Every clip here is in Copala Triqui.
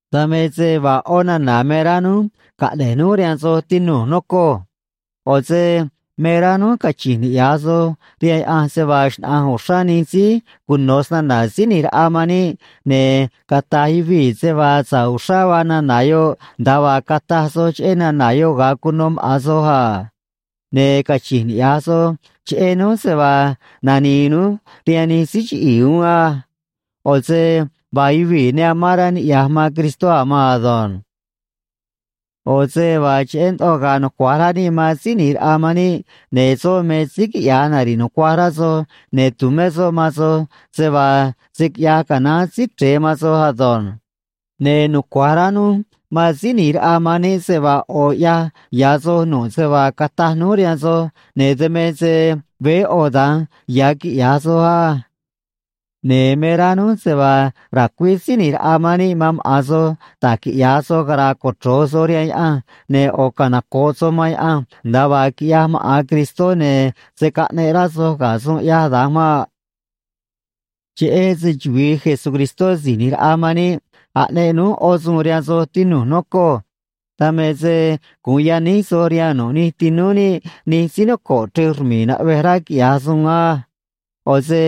Dan me se vaa ꞌó nana̱ me rá núj caꞌne̱j núj rihaan soj, tinu̱j, nocoj. ꞌO̱ se me rá núj cachi̱nj niꞌya̱j soj rihaan Yaꞌanj se vaa xnaꞌa̱nj uxrá nij síí cuno̱ snana̱ Síí ꞌNi̱j Raꞌa man níꞌ, ne̱ cata̱j yuvii̱ se vaa sa̱ꞌ uxrá vaa nana̱ yoꞌ, nda̱a vaa cataj soj cheꞌé nana̱ yoꞌ ga̱a cuno maꞌa̱n soj a. Ne̱ cachi̱nj niꞌya̱j soj cheꞌé núj se vaa nani̱i̱ núj rihaan nij síí chiꞌi̱i̱ uún á. ꞌO̱ se vaa yuvii̱ ne amán rá niꞌya̱j man Cristó a̱ maan ado̱nj. ꞌO̱ se vaa cheꞌé ndoꞌo ga̱a̱ nucua̱j rá níꞌ man Síí ꞌNi̱j Raꞌa man níꞌ, ne̱ soꞌ me síí quiꞌya̱j nari̱ꞌ nucuaj rá soj, ne̱ tu̱mé soꞌ man soj se vaa se̱ quiꞌyaj canaán Síí Chre̱e man soj ado̱nj. Ne̱ nucua̱j rá núj man Síí ꞌNi̱j Raꞌa man níꞌ se vaa ꞌo̱ ꞌyaj ya̱ soj nu̱ꞌ se vaa cataj núj rihaan soj, ne̱ dan me se veé ꞌo̱ da̱nj ya̱ quiꞌya̱j soj á. Ne̱ me rá núj se vaa ra̱cuíj Síí ꞌNi̱j Raꞌa man níꞌ man maꞌa̱n soj da̱j quiꞌya̱j soj, cara̱a̱ cochro̱j soj rihaan Yaꞌanj, ne̱ ꞌo̱ canoco̱ꞌ soj man Yaꞌanj nda̱a vaa quiꞌyaj maꞌa̱n Cristó, ne̱ se̱ caꞌneꞌ rá soj ga̱ suun ꞌyaj da̱nj maꞌ. Cheꞌé se‑chuvi̱i Jesucristó Si̱j ꞌNi̱j Raꞌa man níꞌ, aꞌneꞌ núj ꞌó suun rihaan soj, tinu̱j, nocoj. Dan me se gu̱un yaníj soj rihaan nu̱ꞌ nij tinúú níꞌ nij síí noco̱ꞌ chrej rmi̱i̱ naꞌvej rá quiꞌya̱j suun á. ꞌO̱ se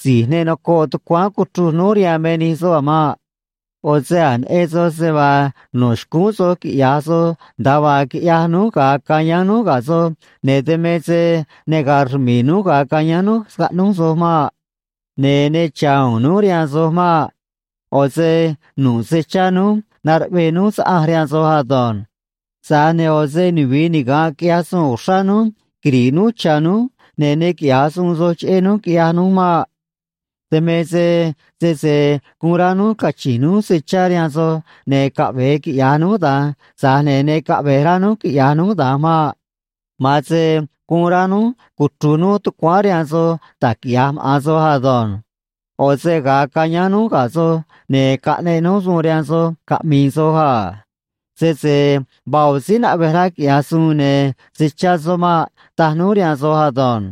si̱j ne nocoꞌ tucuáán cuchruj núj rihaan me nij soꞌ a̱ maꞌ. ꞌO̱ se a̱j neꞌen soj se vaa no̱ xcúún soj quiꞌya̱j soj nda̱a vaa quiꞌyaj núj ga̱a cayáán núj ga̱ soj, ne̱ dan me se ne ga̱a̱ rmi̱i̱ núj ga̱a cayáán núj scaꞌnúj soj maꞌ. Ne̱ ne cha̱ u̱u̱n núj rihaan soj maꞌ. ꞌO̱ se nu̱ꞌ se chá núj naruꞌvee núj saꞌanj rihaan soj ado̱nj. Tza̱j ne̱ ꞌo̱ se nuvi̱i niga̱nꞌ quiꞌyaj suun uxrá núj quiri̱ꞌ núj cha̱ núj, ne̱ ne quiꞌya̱j suun soj cheꞌé núj, quiꞌyaj núj maꞌ. Dan me se sese guun rá núj cachi̱nj núj se chá rihaan soj, ne̱ caꞌve̱e quiꞌya̱j núj da̱nj, tza̱j ne̱ ne caꞌve̱j rá núj quiꞌya̱j núj da̱nj maꞌ. Ma̱an se guun rá núj cuchru̱j núj tucuáán rihaan soj da̱j quiꞌya̱j maꞌa̱n soj ado̱nj. ꞌO̱ se ga̱a cayáán núj ga̱ soj, ne̱ caꞌneꞌ núj suun nihánj rihaan soj caꞌmi̱i̱ soj a: Sese vaa ꞌo̱ síí naꞌvej rá quiꞌya̱j suun, ne̱ se̱ chá soꞌ maꞌ, taj núj rihaan soj ado̱nj.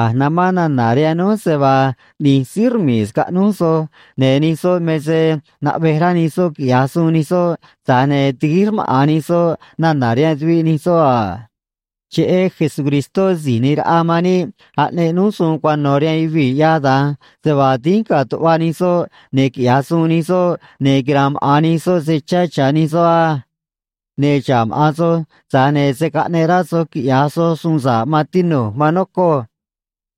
A̱j namán nana̱ rihaan núj se vaa ꞌni̱j síí rmi̱i̱ scaꞌnúj soj, ne̱ nij soꞌ me se naꞌvej rá nij soꞌ quiꞌya̱j suun nij soꞌ, tza̱j ne̱ tiguíj rmaꞌa̱n nij soꞌ nana̱ rihaan tuviꞌ nij soꞌ a. Cheꞌé Jesucristó Si̱j ꞌNi̱j Raꞌa man níꞌ aꞌneꞌ núj suun cuano̱ rihaan yuvii̱ ꞌyaj da̱nj, se vaa dínj ga̱a̱ tuꞌva nij soꞌ, ne̱ quiꞌya̱j suun nij soꞌ, ne̱ quira̱a̱n maꞌa̱n nij soꞌ se chá cha̱ nij soꞌ á. Ne̱ xa̱ꞌ maꞌa̱n soj, tza̱j ne̱ se̱ caꞌneꞌ rá soj quiꞌya̱j soj suun sa̱ꞌ, maan tinu̱j, maan nocoj.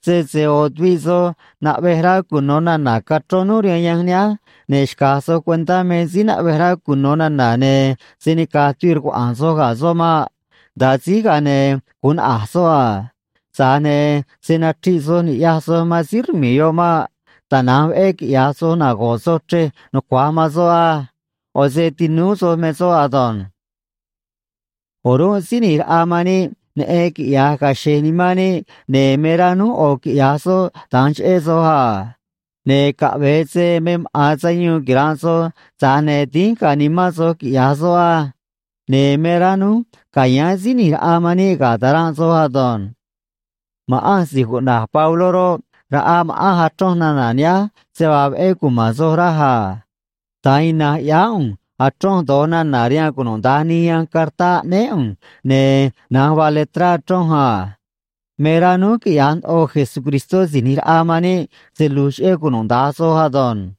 Sese ꞌo̱ tuviꞌ soj naꞌvej rá cuno̱ nana̱ cachrón núj rihaan yanj nihánj, ne̱ xca̱j soj cuentá me síí naꞌvej rá cuno̱ nana̱, ne̱ se̱ nica̱j tuviꞌ rcuaꞌa̱a̱n soj ga̱ soꞌ maꞌ. Nda̱a síj, ga̱a ne̱ gu̱un naꞌa̱j soꞌ a. Tza̱j ne̱ se̱ nachriꞌ soj ni̱ꞌyaj soj man síí rmi̱i̱ yoꞌ maꞌ. Tana̱nj veꞌé quiꞌya̱j soj, nago̱ꞌ soj chrej nucua̱j man soꞌ á. ꞌO̱ se tinúú soj me soꞌ ado̱nj. O̱rúnꞌ Síí ꞌNi̱j Raꞌa man níꞌ neꞌen quiꞌya̱j ga̱a̱ xe̱j nimán níꞌ, ne̱ me rá núj ꞌo̱ quiꞌya̱j soꞌ da̱nj cheꞌé soj a. Ne̱ caꞌve̱e se me maꞌa̱n sayuun quira̱nꞌ soj, tza̱j ne̱ dínj ga̱a̱ nimán soj, quiꞌya̱j soꞌ á. Ne̱ me rá núj ca̱yáán Síí ꞌNi̱j Raꞌa man níꞌ ga̱ ta̱ranꞌ soj ado̱nj. Ma̱ꞌanj si̱j cuꞌna̱j Pabló roꞌ, raꞌaj ma̱ꞌanj achronj nana̱ nihánj se vaa veꞌé cuma̱n soj raj a. Da̱nj ina̱nj ꞌyáá ꞌu̱nj achronj do̱j nana̱ rihaan cunuda̱nj nij yanj cartá aꞌnéé ꞌu̱nj, ne̱ na̱nj vaa letrá achronj a. Me rá núj quiꞌya̱j ndoꞌo Jesucristó Si̱j ꞌNi̱j Raꞌa man níꞌ se lu̱j cheꞌé cunuda̱nj soj ado̱nj.